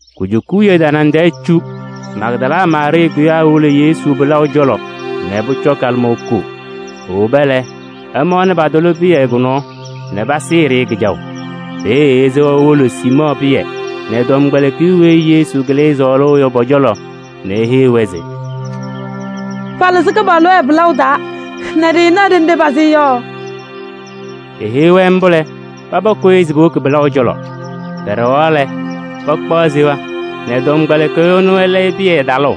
Kujuka wiye tanaŋ tɛɛ cu Magdala Maarɩɩ kʋyaa nɛ ewolo Yesu pɩlaʋ cɔlɔ nɛ pʋcɔ kalɩmaŋ koo. Ewoba lɛ, ɛmaɣnɩ patʋlɩ pɩyɛ kʋ-nɔɔ nɛ pasɩɩ-ɖɩ kɩjaʋ. Peeye esewa nɛ ewolo Siimɔɔ Pɩyɛ nɛ tɔmkpɛlɩkɩyʋ weyi Yesu kɩlɩ sɔɔlʋʋ yɔ pɔ-cɔlɔ nɛ eheyi-wɛ se: “Palɩzɩ Kɩpaɣlʋ ɛ-pɩlaʋ taa nɛ ɖɩɩnaɣ ɖenɖe pasɩ-ɩ yɔ.” Eheyi-wɛ mbʋ lɛ, paba kʋyɩ se powoki pɩlaʋ cɔlɔ. Pɛɖɛɣaɣ lɛ, pakpaɣ seya nɛ tɔmkpɛlɩkɩyʋ ɛnʋ ɛlɛyɩ Pɩyɛ talʋʋ.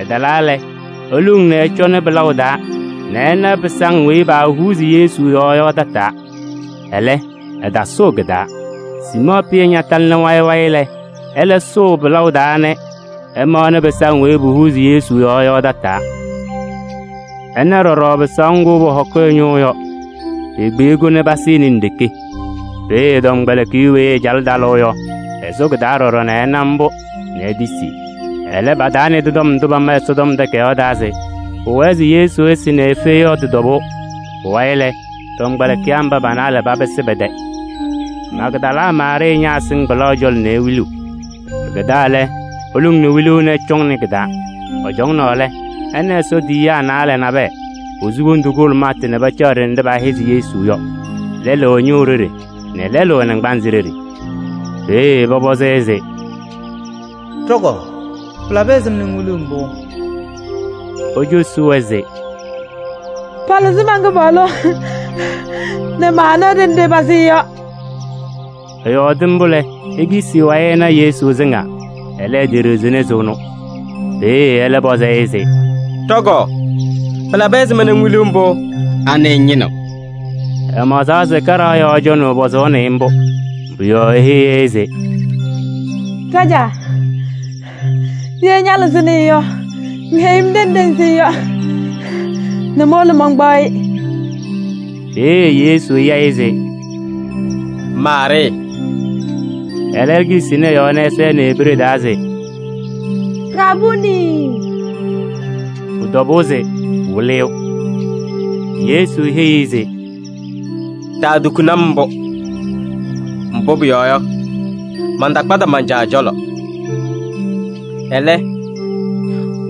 Ɛtalaa lɛ, eluŋ nɛ ɛcɔnɩ pɩlaʋ taa nɛ ɛna pɩsaŋ weyi paahuuzi Yesu yɔɔ yɔ tataa. Ɛlɛ, ɛtasʋʋ kɩ-taa. Siimɔɔ Pɩyɛ ñatalɩ wayɩ wayɩ lɛ, ɛlɛ sʋʋ pɩlaʋ taa nɛ ɛmaɣnɩ pɩsaŋ weyi paahuuzi Yesu yɔɔ yɔ tataa. Ɛna ɖɔɖɔ pɩsaʋ ŋgʋ paahɔkɩ ɛ-ñʋʋ yɔ. Pekpiyi-kʋ nɛ pasɩnɩ nɖeke. Peeye tɔmkpɛlɩkɩyʋ lɛlʋ weyi ɛcalɩ talʋʋ yɔ, ɛsʋ kɩ-taa ɖɔɖɔ nɛ ɛna mbʋ nɛ etisi. Ɛlɛ, pataanɩdɩ tɔm ndʋ pama Ɛsɔtɔm Takayaɣ taa se pʋwɛɛ se Yesu ɛsɩ nɛ efe yɔ tɩ-tɔbʋʋ. Pʋwayɩ lɛ, tɔmkpɛlɩkɩyaa mba pa-naalɛ papɩsɩ pɛ-tɛ. Magdala Maarɩɩ ñaasɩŋ pɩlaʋ cɔlɔ nɛ ewiliɣ. Pɩkɛdaa lɛ, eluŋ nɛ wiluu se ɛcɔŋnɩ kɩ-taa. Ɛcɔnaa lɛ, ɛna Ɛsɔ tiyiyaa naalɛ nabɛyɛ, posu wondu kʋhʋlʋmʋtʋ nɛ pacaɣ ɖenɖe paahɛzɩ Yesu yɔ: lɛlʋ ɛ-ñʋʋ ɖeɖe nɛ lɛlʋ ɛ-naŋgbanzɩ ɖeɖe. Peeye pɔpɔzɩ-ɩ se: “Ɖɔ-kɔɔ! Pɩlabɩ ɛzɩma nɛ ŋwiliɣ mbʋ?” Ecosi-wɛ se: “Palɩzɩ man-Kɩpaɣlʋ nɛ maanaɣ ɖenɖe pasɩ-ɩ yɔ.” Ɛyɔɔdɩ mbʋ lɛ, ekisi ɛ-wayɩ nɛ ɛna Yesu sɩŋaa. Ɛlɛ, eteɖiɣzini se ɛnʋ. Peeye ɛlɛ pɔzɩ-ɩ se: “Ɖɔ-kɔɔ! Pɩlabɩ ɛzɩma nɛ ŋwiliɣ mbʋ? Anɩ ŋñɩnɩɣ?” Ɛmaɣzaɣ se kaɖaɣ yɔɔ cɔnɩyʋ pɔzʋʋnɩ-ɩ mbʋ. Pʋ-yɔɔ eheyi-i se: “Ɖajaa! Ye ñalɩzɩnɩ-ɩ yɔ, ŋheyi-m ɖenɖe ŋsɩ-ɩ yɔ nɛ mowolo mankpaɣ-ɩ.” Peeye Yesu ya-ɩ se: “Maarɩɩ!” Ɛlɛ ekisini ɛ-yɔɔ nɛ ɛsɛnɩ Ebree taa se: “Rabuunii!” Pʋ-tɔbʋʋ se Wɩlɩyʋ. Yesu heyi-i se: “Taatukuni-m mbʋ, mbʋ pʋyɔɔ yɔ, mantakpadɩ man-Caa cɔlɔ. Ɛlɛ,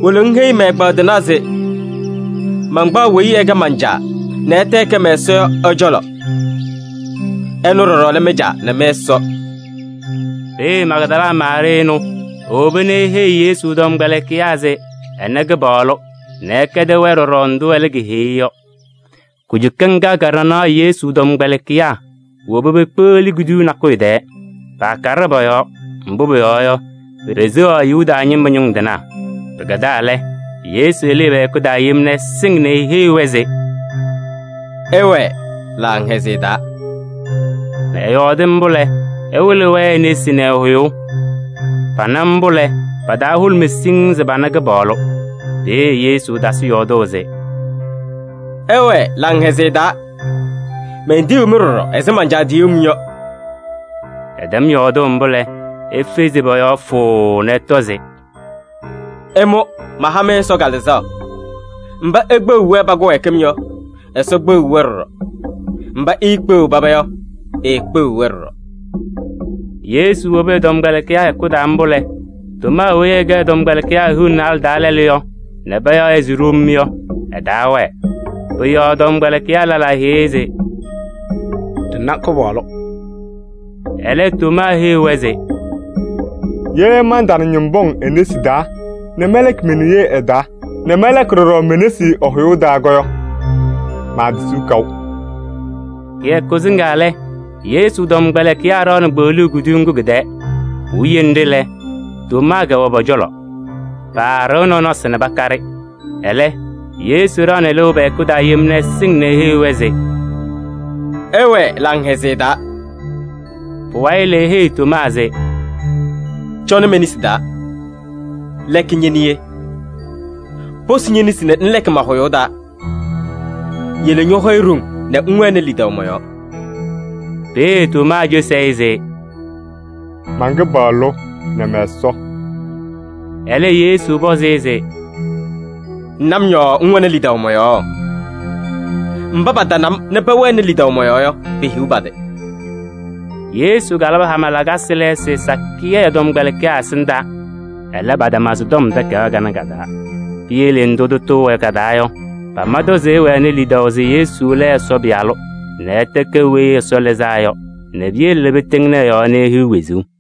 wolo ŋheyi mɛ-ɛgbaadɩnaa se mankpaɣ weyi ɛkɛ man-Caa nɛ ɛtɛ ɛkɛ mɛ-Ɛsɔ yɔ ɛ-cɔlɔ. Ɛnʋ ɖɔɖɔ lɛ mɩ-Caa nɛ mɩ-Ɛsɔ.” Peeye Magdala Maarɩɩ ɛnʋ ewoba nɛ eheyi Yesu tɔmkpɛlɩkɩyaa se ɛna Kɩpaɣlʋ nɛ ɛkɛdɩ-wɛ ɖɔɖɔ ndʋ ɛlɛ keheyi-i yɔ. Kujuka ŋga ka-ɖanaɣ Yesu tɔmkpɛlɩkɩyaa woba pekpeɣli kuduyuu nakʋyʋ tɛɛ. Paakaɖɩ pɔ-yɔɔ, mbʋ pʋyɔɔ yɔ, peseɣaɣ Yuda ñɩma ñʋŋ tɩnaa. Pɩkɛdaa lɛ, Yesu lɩɩ pɛ-hɛkʋ taa yem nɛ ɛsɩŋ nɛ eheyi-wɛ se: “Ɩwɛɛ laŋhɛzɩyɛ taa!” Ɛyɔɔdɩ mbʋ lɛ, ɛwɩlɩ-wɛ e-nesi nɛ ɛ-hʋyʋʋ. Pana mbʋ lɛ, pa-taa hʋlʋmɩ siŋŋ se pana Kɩpaɣlʋ. Peeye Yesu tasɩ yɔɔdʋʋ se: “Ɩwɛɛ laŋhɛzɩyɛ taa! Mentiyiɣ-mɩ ɖɔɖɔ ɛzɩ man-Caa tiyuu-m yɔ.” Ɛtɛm yɔɔdʋʋ mbʋ lɛ, efezi pɔ-yɔɔ fʋʋʋ nɛ ɛtɔ se: “Ɩmʋ maha-mɩ Ɛsɔ Kalɩzaɣ! Mba ikpeɣiɣ-wɛ pa-kɩwɛɛkɩm yɔ, Ɛsɔ kpeɣiɣ-wɛ ɖɔɖɔ. Mba iikpeɣiɣ paba yɔ, eekpeɣiɣ-wɛ ɖɔɖɔ.” Yesu wobi ɛ-tɔmkpɛlɩkɩyaa hɛkʋ taa mbʋ lɛ, Tomaa weyi ɛkɛ ɛ-tɔmkpɛlɩkɩyaa hiu nɛ naalɛ taa lɛlʋ nɛ payaɣ-ɩ se Ɖom yɔ, ɛtaawɛɛ. Pʋ-yɔɔ tɔmkpɛlɩkɩyaa lɛlaa heyi-i se: “Ɖɩna Kɩpaɣlʋ.” Ɛlɛ, Tomaa heyi-wɛ se: “Ye mantana ñɩma pɔŋ e-nesi taa nɛ mɛlɛkɩ me-niye ɩ-taa nɛ mɛlɛkɩ ɖɔɖɔ me-nesi ɛ-hʋyʋʋ taa yɔ, maatisiɣ kaʋ.” Kɩyakʋ sɩŋaa lɛ, Yesu tɔmkpɛlɩkɩyaa ɖaɣnɩ kpeɣluu kuduyuu ŋgʋ kɩ-tɛɛ. Puwiye nɖɩ lɛ, Tomaa kɛwɛ pɔ-cɔlɔ. Paaɖɩɣ nɔnɔsɩ nɛ pakaɖɩ. Ɛlɛ, Yesu ɖaɣnɩ lɩʋ pɛ-hɛkʋ taa yem nɛ ɛsɩŋ nɛ eheyi-wɛ se: “Ɩwɛɛ laŋhɛzɩyɛ taa!” Pʋwayɩ lɛ, eheyi Tomaa se: “Cɔnɩ me-nesi taa, lɛkɩ ñe-niye, posi ñe-nesi nɛ ŋlɛkɩ ma-hʋyʋʋ taa. Yele ñɔ-hɔyɛ ɖoŋ nɛ ŋwɛnɩ lidaʋ mɔ-yɔɔ.” Peeye Tomaa cosi-i se: “Man-Kɩpaɣlʋ! Mɛ-Ɛsɔ!” Ɛlɛ Yesu pɔzɩ-ɩ se: “Ŋna-m yɔɔ ŋwɛnɩ lidaʋ mɔ-yɔɔ? Mba patana-m nɛ pɛwɛnɩ lidaʋ mɔ-yɔɔ yɔ, pehiɣ pa-tɩ!” Yesu kalabɩ hama lakasɩ lɛɛsɩ sakɩyɛ ɛ-tɔmkpɛlɩkɩyaa ɛsɩndaa, ɛlɛ, patama sɩ-tɔm takayaɣ kanɛ ka-taa. Piyele ndʋ tʋtʋ wɛ ka-taa yɔ, pama-tʋ se ɩwɛnɩ lidaʋ se Yesu lɛ Ɛsɔ Pɩyalʋ nɛ ɛtɛ ɛkɛ Weyi Ɛsɔ Lɩzaa Yɔ nɛ piyele pɩtɩŋnɩ ɛ-yɔɔ nɛ ihiɣ wezuu.